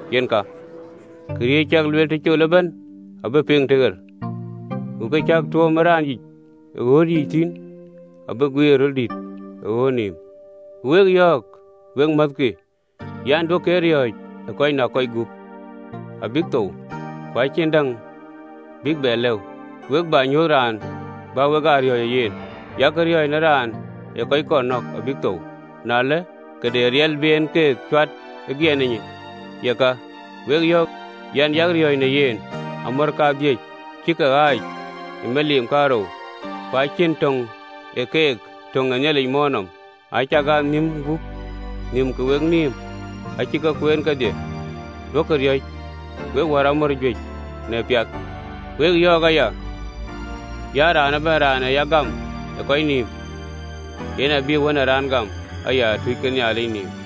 Yen ka, këriëëc cäk lueel tëcol ëbɛ̈n abï ke piŋ tëɣer, ku kë cäk tuöm ë raan yïc ë ɣööt yiic thïn abï guiir ë röl dït ë ɣööt nïïm. “Ku wek yɔ̈ɔ̈k, wek määthkï an, duökï ee riɔ̈ɔ̈c ë kɔc näk kɔc gup abïk thou, ku acïn däŋ bïk bɛ lëu. Ku we bä nyuöth raan bä wek aa riɔ̈ɔ̈c ë yen: Yak riɔ̈ɔ̈c në raan ë kɔc kɔn nɔ̈k abïk thou, na ëlë, ke de riɛl bï en ke cuat ë giɛna yic, yeka, wek yɔ̈ɔ̈k an, Yak riɔ̈ɔ̈c në yen! “Amɔ̈r kadhïc cïï ke ee ɣaac ë miliim kaarou? Ku acïn tök ë keek töŋ ee Nhialic möör nɔm. Acakaa nhïm gup nhïm ke wenïïm acï ke kueen kedhie. Duökï riɔ̈c, wek wär amɔ̈r juëc në piath! “Wek yɔ̈ɔ̈k aya an, Raan ëbɛ̈n raan ee ya gam ë kɔc nïïm, yen abïï Wën ë Raan gam aya ë tuuc ke Nhialic nïïm.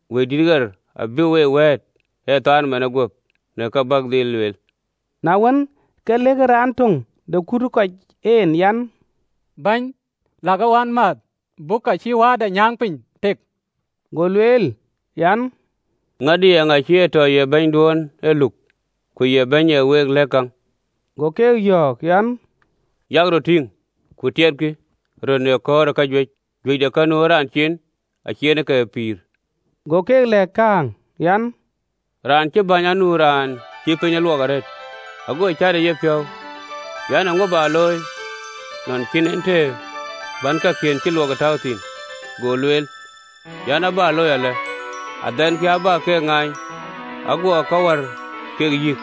Wëidït ɣer abïk we wɛ̈ɛ̈t ë thaar manë guöp në kë bäk dhil lueel.” Na wën, ke lëkë raan töŋ de kut ë kɔc en an, “Bɛ̈ny, lɛ̈kë wänmääth, buk ka cïï wääda nyäŋ piny tek.” Go lueel an, “Ŋadï, eeŋa cï a tɔ ye bɛ̈nyduön ë luk ku ya bɛ̈ny ee week tɛ̈k käŋ?” Go keek yɔ̈ɔ̈k an, “Yak röt tïŋ, ku tiɛtkï röt në kɔ̈ɔ̈r ë kajuëc, juëc de ka nu ë raan cin acïï en ke ee pïïr.” Go keek lɛ̈k kääŋ an, “Raan cï bäny anu raan cï pinyde luɔk arëët. Ago cät ë yepiɔ̈u an, ‘Eeŋö bä looi, nɔn cïn en të bän kakiën cï luɔk tääu thïn?’ Go lueel an, ‘Abä looi alë: Adhɛnkï abä ke ŋaany, aguɔ ka wär keek yïk: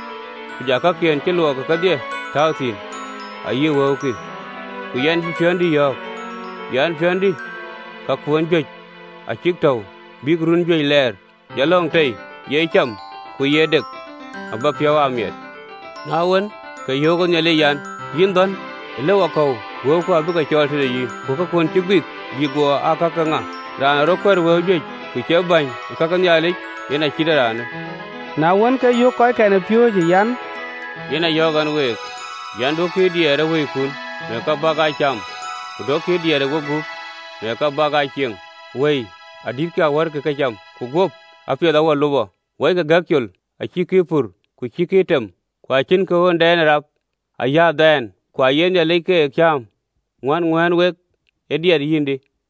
ku ja kakiën cï luɔk kedhie tääu thïn ayï wëukï. Ku yɛn bï piɔ̈ndï yɔ̈ɔ̈k an, piɔ̈ndï, kakuön juëc acï ke tɔ̈ɔ̈u bïk run juëc lɛɛr, jɔ lɔ̈ŋ tei, ye cam, ku ye dek, abä piɔ̈u aa miɛt.’ Na wën, ke yöök ë Nhialic an, ‘Yïn dhɔ̈n! Ëlëwakɔ̈u wëiku abï ke cɔɔl tëde yïn: ku kakuön cï guik bïk guɔ aa ka ke ŋa?”’ Go Yecu lueel an, “Raan ee rɔt kuɛ̈t wëu juëc, ku cie bäny ë ka ke Nhialic, yen acït ee raanë.” Na wën, ke yöök kɔckɛn ë piööcë an, “Yen a yɔ̈ɔ̈k ɛn week an, “Duökï ee diɛɛr ë wëikun në kë bäk aa cam, ku duökï ee diɛɛr ë wegup, në kë bäk aa cieŋ. Wëi adïtkï awärkï këcam, ku guöp apiɛth awär lupɔ. Wɔikï gɛk col, acïkï ee pur, ku acïkï ee tem, ku acïnkï ɣöndɛn ë rap ayï adhaan, ku aye Nhialic ke cääm! Ŋuän ŋuään wek ë diɛt yïndï?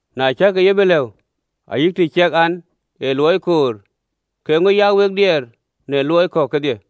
Na cäkï ye bï lëu ayï të ciɛk en aa luɔi koor, ke eeŋö ya wek diɛɛr në luɔi kɔ̈k kedhie?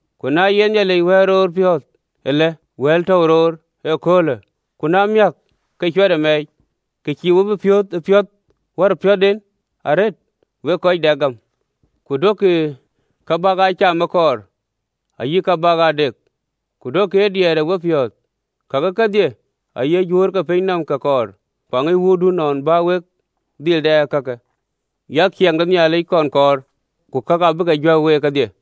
Ku na ye Nhialic wɛl roor piöth alë, wɛl tɔ̈u roor ëköölë, ku na miäk ke cuɛtë mɛɛc, ke cïï we bï piöth ë piöth wär piöthden arëët, wek kɔc dɛk ë gäm! Ku duökï kë bäk aa cam ee kɔɔr, ayï ka bäk aa dek, ku duökï ee diɛɛr ë wepiɔ̈ɔ̈th. Kakë kedhie aye juöör ke piny nɔm ke kɔɔr: ku aŋic Wuöördun nɔn bä wek dhil dɛ kakë. Yak ciɛɛŋ de Nhialic kɔn kɔɔr, ku kakë abï ke juɛ̈k week kedhie.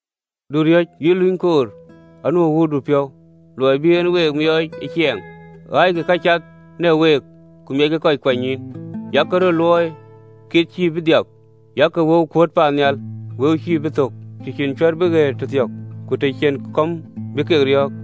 “Du riɔ̈c, yïn luny koor: anu ë Wuöördun piɔ̈u luɔi bï en we miɔɔc ë ciɛɛŋ. Ɣaackï ka cath në week, ku miackï kɔc kuanynyïïn, yak röt luɔi anyɔŋɔɔ cïï bï dhiap, yak wëu kueet paannhial wëu cïï bï thök, të cïn cuɛ̈ɛ̈r bï ɣëët tëthiɔ̈k, ku të cïn kɔ̈m bï ke riɔ̈ɔ̈k.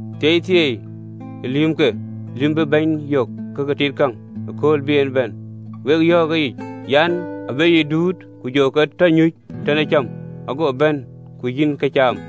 Thieithieei lïïmkë, lïïm bïï bɛ̈ny yök ke ke tit käŋ, kööl bï en bɛ̈n! Wek yɔ̈ɔ̈k ëyic an, abï ë yic duut, ku jɔ ke tɔ nyuc tën ee cäm, ago bɛ̈ny ke yiɛ̈n këcam.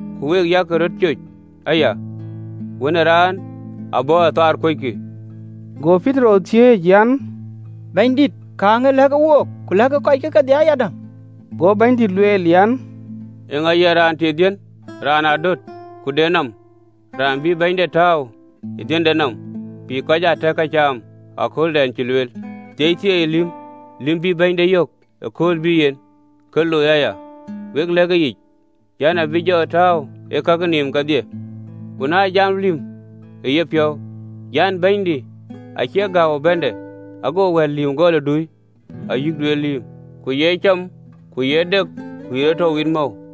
Ku week, yak röt coc aya, Wën ë Raan abɔ̈ ë thaar kuöckï.” Go Petero thiëëc an, “Bɛ̈nydït, kääŋë lɛ̈kë wook, ku lɛ̈kë kɔc kedhie ayadäŋ?” Go Bɛ̈nydït lueel an, “Eeŋa ye raan tit dhiën, raan adöt ku de nɔm, raan bïï bɛ̈nyde tääu ë dhiënde nɔm, bï kɔc aa tɛ̈k këcam ëkööldɛn cï lueel? Thieithieei lïmë, lïm bïï bɛ̈nyde yök ëkööl bïï yen, ke looi aya. Wek yɔ̈ɔ̈k an, abï jɔ tääu ë kakë nïïm kedhie. Ku na jam lïmë ë yepiɔ̈u an, bɛ̈nydï acï gääu ë bɛ̈nde, ago wɛ̈ɛ̈t lïïm gɔl ë dui ayï duet lïïm, ku ye cam ku ye dek ku ye rɔt tɔ wit mɔ̈u,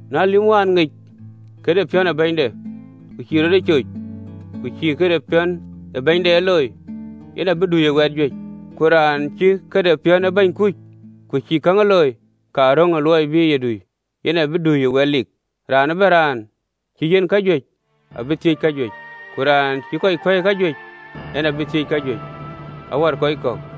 Ku lïm wään ŋic këde piɔ̈n ë bɛ̈nyde, ku cïï rɔt ee coc, ku cïï këde piɔ̈n ee bɛ̈nyde ë looi, yen abï dui ë wɛt juëc. Ku raan cï këde piɔ̈n ë bɛ̈ny kuc, ku cï käŋ looi ka röŋ ë luɔi bï ye dui, yen abï dui ë wɛt lik. Raan ëbɛ̈n raan cï yiɛ̈n kajuëc, abï thiëc kajuëc, ku raan cï kɔc kuɛ̈i kajuëc, en abïk thiëc kajuëc wär kɔc kɔ̈k.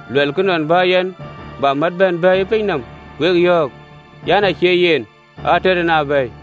Luɛlkï nɔn bä yɛn bä mät bɛ̈n bɛ̈ɛ̈i ë piny nɔm? Wek yɔ̈ɔ̈k an, acie yen, ater en a bɛ̈ɛ̈i.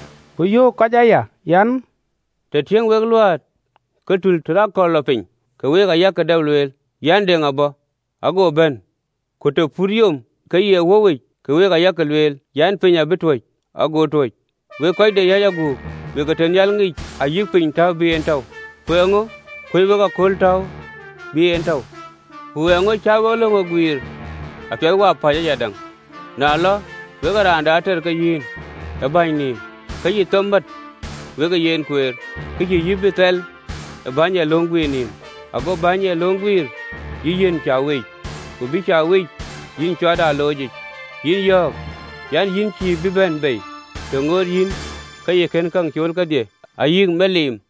Ku yöök kuut ë kɔc aya an, “Të tiëŋ wek luät ke tul të lɔ aköl athɛ̈i, ke wek ayak dap lueel an, deŋ abɔ̈, ago bɛ̈n. Ku të putë yom ke ye wöuwic, ke wek ayak lueel an, piny abï tuöc, ago tuöc. Wek kɔc de yäc aguk, wek ee tënhial ŋic ayï piny täu bï kek tɔ̈u, ku eeŋö kuöc wek ee köölë täu bï en tɔ̈u? Ku eeŋö cä wek löŋ ee guiir apiɛth wapäc ayadäŋ? Na lɔ we raan de ater ke yïn ë bɛ̈ny nɔm, ke yï them mät wekë yen kueer, ke cïï yï bï thɛl ë bɛ̈ny ë löŋ guiir nɔm, ago bɛ̈ny ë löŋ guiir yï yiɛ̈n bɛ̈ny de rem, ku bï bɛ̈ny de rem yï cuat ë aloocic. Yïn yɔ̈ɔ̈k an, yïn cïï bï bɛ̈n bei, të ŋoot yïn ke yï kën käŋ cool kedhie, ayï miliim.”